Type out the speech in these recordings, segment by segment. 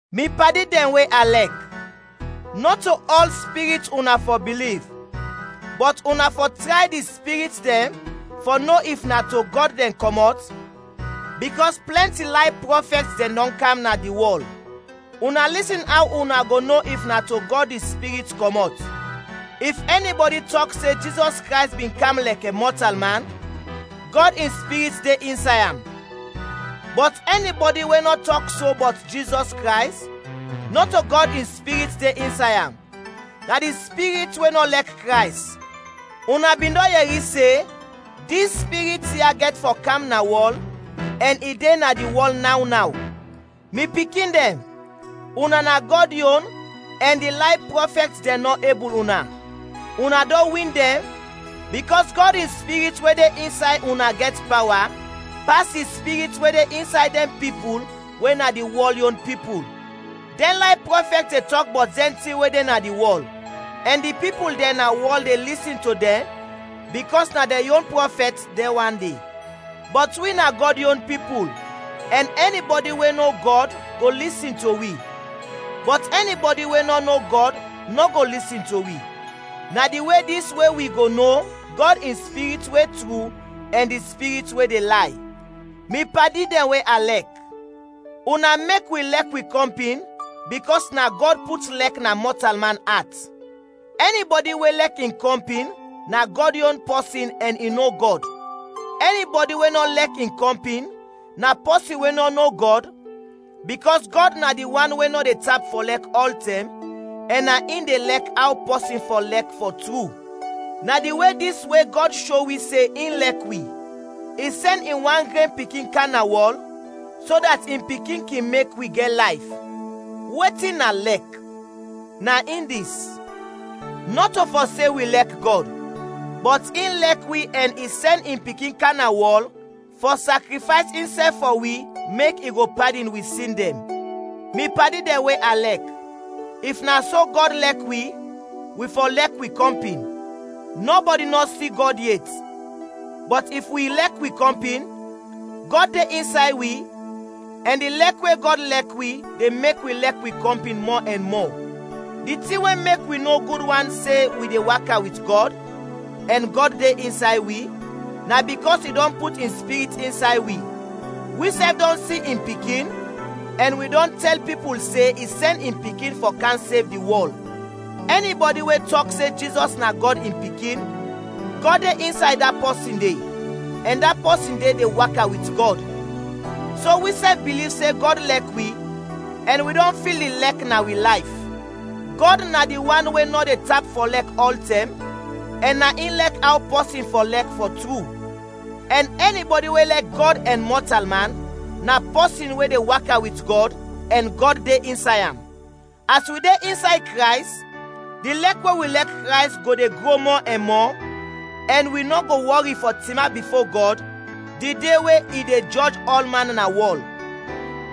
Mi padi dɛn we a lɛk, nɔto ɔl spirit una fɔ biliv, bɔt una fɔ tray di spirit dɛn fɔ no if na to Gɔd dɛn kɔmɔt, bikɔs plɛnti lay prɔfɛt dɛn dɔn kam na di wɔl. Una lisin aw una go no if na to Gɔd di Spirit kɔmɔt. If ɛni bɔdi tɔk se Jizɔs Krays bin kam lɛkɛ mɔtalman, Gɔd in Spirit de insay am. Bɔt ɛni bɔdi we nɔ tɔk so bɔt Jizɔs Krays, nɔto Gɔd in Spirit de insay am, na di spirit we nɔ lɛk Krays. Una bin dɔn yɛri se dis spirit ya gɛt fɔ kam na wɔl ɛn i de na di wɔl naw naw. Mi pikin dɛn, una na Gɔd yon ɛn di lay prɔfɛt dɛn nɔ ebul una, una dɔn win dɛn, bikɔs Gɔd in Spirit we de insay una gɛt pawa pas di spirit we de insay dɛn pipul we na di wɔl yon pipul. Dɛn lay prɔfɛt de tɔk bɔt dɛn tin we de na di wɔl, ɛn di pipul dɛn na wɔl de lisin to dɛn bikɔs na dɛn yon prɔfɛt dɛn wan de. Bɔt wi na Gɔd yon pipul ɛn ɛni bɔdi we no Gɔd go lisin to wi, bɔt ɛni bɔdi we nɔ no Gɔd nɔ go lisin to wi. Na di we dis we wi go no Gɔd in Spirit we tru ɛn di spirit we de lay. Mi padi dɛn we a lɛk, una mek wi lɛk wi kɔmpin bikɔs na Gɔd put lɛk na mɔtalman at. Ɛni bɔdi we lɛk in kɔmpin na Gɔd yon pɔsin ɛn i no Gɔd. Ɛni bɔdi we nɔ lɛk in kɔmpin, na pɔsin we nɔ no Gɔd bikɔs Gɔd na di wan we nɔ de tap fɔ lɛk ɔltɛm ɛn na in de lɛk aw pɔsin fɔ lɛk fɔ tru. Na di we dis we Gɔd sho wi se in lɛk wi: I sɛn in wan gren Pikin kam na wɔl, so dat in Pikin kin mek wi gɛt layf. Wetin na lɛk? Na in dis: Nɔto fɔ se wi lɛk Gɔd, bɔt in lɛk wi ɛn i sɛn in Pikin kam na wɔl fɔ sakrifays insɛf fɔ wi mek i go padin wi sin dɛn. Mi padi dɛn we a lɛk, if na so Gɔd lɛk wi, wi fɔ lɛk wi kɔmpin. Nɔbɔdi nɔ si Gɔd yet, bɔt if wi lɛk wi kɔmpin, Gɔd de insay wi ɛn di lɛk we Gɔd lɛk wi de mek wi lɛk wi kɔmpin mɔ ɛn mɔ. Di tin we mek wi no gud wan se wi de waka wit Gɔd ɛn Gɔd de insay wi, na bikɔs i dɔn put in Spirit insay wi. Wisɛf dɔn si in Pikin ɛn wi dɔn tɛl pipul se i sɛn in Pikin fɔ kam sev di wɔl. Ɛni bɔdi we tɔk se Jizɔs na Gɔd in Pikin, Gɔd de insay da pɔsin de ɛn da pɔsin de de waka wit Gɔd. So wisɛf biliv se Gɔd lɛk wi, ɛn wi dɔn fil di lɛk na wi layf. Gɔd na di wan we nɔ de tap fɔ lɛk ɔltɛm ɛn na in lɛk aw pɔsin fɔ lɛk fɔ tru, ɛn ɛni bɔdi we lɛk Gɔd ɛn mɔtalman, na pɔsin we de waka wit Gɔd ɛn Gɔd de insay am. As wi de insay Krays, di lɛk we wi lɛk Krays go de gro mɔ ɛn mɔ, ɛn wi nɔ go wɔri fɔ tinap bifo Gɔd di de we i de jɔj ɔlman na wɔl,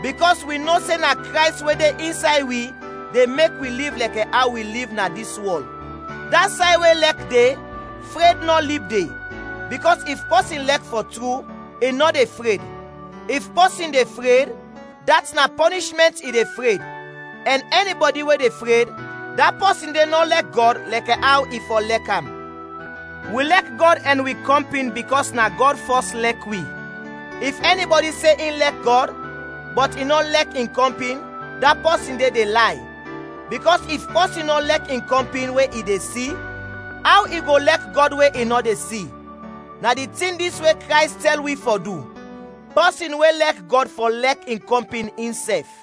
bikɔs wi no se na Krays we de insay wi de mek wi liv lɛkɛ aw wi liv na dis wɔl. Da say we lɛk de, fred nɔ lib de, bikɔs if pɔsin lɛk fɔ tru, i nɔ de fred. If pɔsin de fred, dat na pɔnishmɛnt i de fred ɛn ɛni bɔdi we de fred, da pɔsin de nɔ lɛk Gɔd lɛk aw i fɔ lɛk am. Wi lɛk Gɔd ɛn wi kɔmpin bikɔs na Gɔd fɔs lɛk wi. If ɛni bɔdi se in lɛk Gɔd, bɔt i nɔ lɛk in kɔmpin, da pɔsin de de lay. Bikɔs if pɔsin nɔ lɛk in kɔmpin we i de si, aw i go lɛk Gɔd we i nɔ de si? Na di tin dis we Krays tɛl wi fɔ du: pɔsin we lɛk Gɔd fɔ lɛk in kɔmpin insɛf.